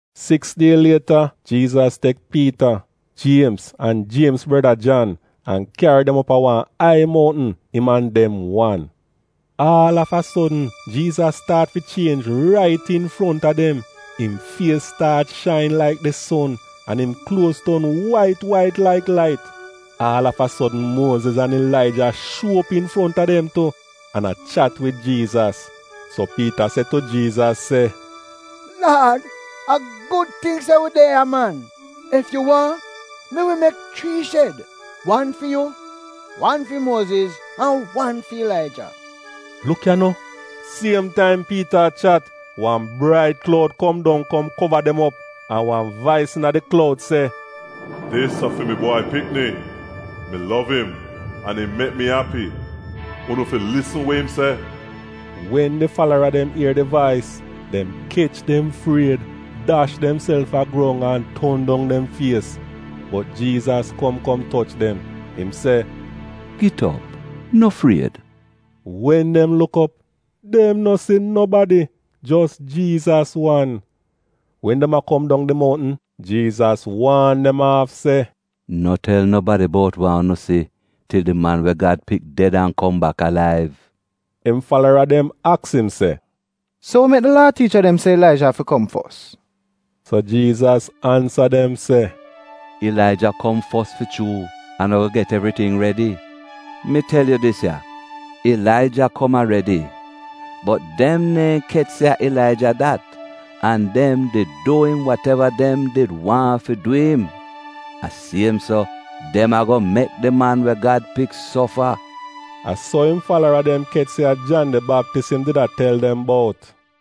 Siks die lieta Jiizas tek Piita, Jiemz an Jiemz breda, Jan, an kyari dem go op a wan ai mountn, im an dem wan. Aal av a sodn Jiizas staat fi chienj rait infronta dem. Im fies staat shain laik di son an im kluoz ton wait wait laik lait. Aal av a sodn Muoziz an Ilaija shuo op infronta dem tu, an a chat wid Jiizas. So Piita se tu Jiizas se, “Laad, a gud ting se wi de ya man! Ef yu waahn, mi wi mek chrii shed — wan fi yu, wan fi Muoziz an wan fi Ilaija.” Luk ya no, siem taim Piita a chat, wan brait kloud kom dong kom kova dem op, an wan vais iina di kloud se, “Dis a fi mi Bwai Pikni, mi lov im, an im mek mi api. Unu fi lisn we im se!” Wen di falara dem ier di vais, dem kech dem fried, dash demself a grong an ton dong dem fies. Bot Jiizas kom kom toch dem. Im se, “Git op. No fried.” Wen dem luk op, dem no si nobadi, jos Jiizas wan. Wen dem a kom dong di mountn, Jiizas waan dem aaf se, “No tel nobadi bout wa unu si til di Man we Gad Pik ded an kom bak alaiv.” Im falara dem aks im se, “So wa mek di Laa tiicha dem se Ilaija afi kom fos?” So Jiizas ansa dem se, “Ilaija kom fos fi chuu an a-go get evriting redi. Mi tel yu dis ya, Ilaija kom aredi. Bot dem neehn kech se a Ilaija dat, an dem did du im wat-eva dem did waahn fi dwi'im. A siem so, dem a-go mek di Man we Gad Pik sofa.” A so im falara dem kech se a Jan di Baptis im did a tel dem bout.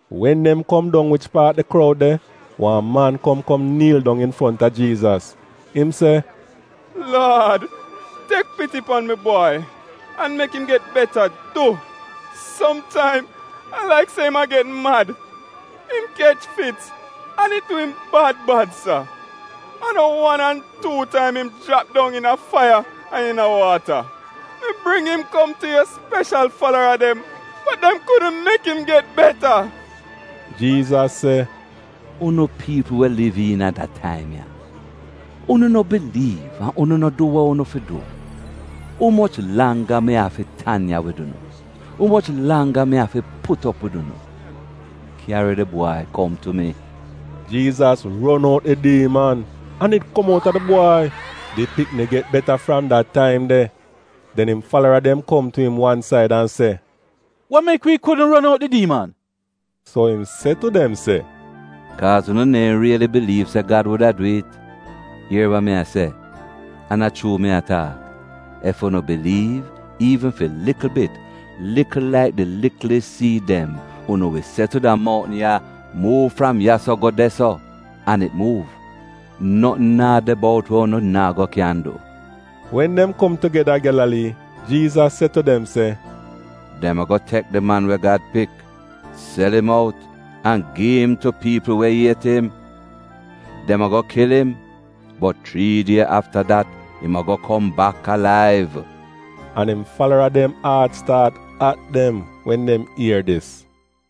Wen dem kom dong wich paat di kroud de, wan man kom kom niil dong infronta Jiizas, im se, “Laad, tek piti pan mi bwai an mek im get beta du. Somtaim a laik se im a get mad. Im kech fits an it du im bad bad sa. An no wan an tuu taim im jrap dong iina faiya, an iina waata. Mi bring im kom tu yu speshal falara dem bot dem kudn mek im get beta.” Jiizas se, “Unu piipl we liv iina da taim ya! Unu no biliiv an unu no du we unu fi du. Umoch langga mi afi tan ya wid unu? Umoch langga mi afi put op wid unu? Kyari di bwai kom tu mi.” Jiizas ron out di diiman, an it kom outa di bwai. Di pikni get beta fram da taim de. Den im falara dem kom tu im wan said an se, “Wa mek wi kudn ron out di diiman?” So im se tu dem se, “Kaaz unu neehn riili biliiv se Gad wuda dwi'it. Ier wa mi a se, an a chuu mi a taak, ef unu biliiv, iivn fi likl bit — likl laik di liklis siid dem, unu wi se tu da moutn ya, ‘Muuv fram ya-so go de-so,’ an it muuv. Notn naa de bout we unu naa go kyan du.” Wen dem kom tugeda a Gyalalii, Jiizas se tu dem se, “Dem a-go tek di Man we Gad Pik, sel im out an gi im tu piipl we iet im. Dem a-go kil im, bot chrii die afta dat im a-go kom bak alaiv.” An im falara dem aat staat at dem wen dem ier dis.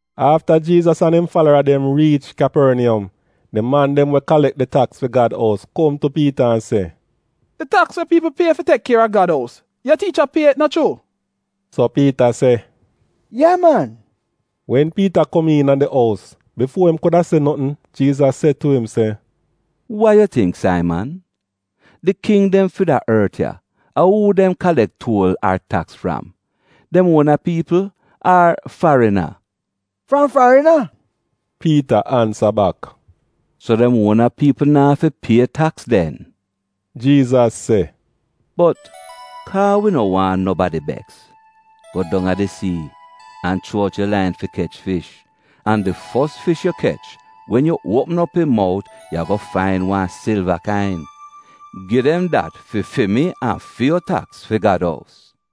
Afta Jiizas an im falara dem riich Kyaporniyom, di man dem we kalek di taks fi Gad ous kom tu Piita an se, “Di taks we piipl pie fi tek kier a Gad ous, yu tiicha pie it, no chuu?” So Piita se, “Ye man.” Wen Piita kom iina di ous, bifuo im kuda se notn Jiizas se tu im se, “Wa yu tingk Saiman? Di king dem fi da ort ya, a uu dem kalek tuol ar taks fram: dem uona piipl ar farina?” “Fram farina,” Piita ansa bak. “So dem uona piipl na'afi pie taks den,” Jiizas se. “Bot, kaa wi no waahn nobadi beks, go dong a di sii an chuo out yu lain fi kech fish, an di fos fish yu kech wen yu uopm op im mout yu a-go fain wan silva kain. Gi dem dat fi fi mi an fi yu taks fi Gad ous.”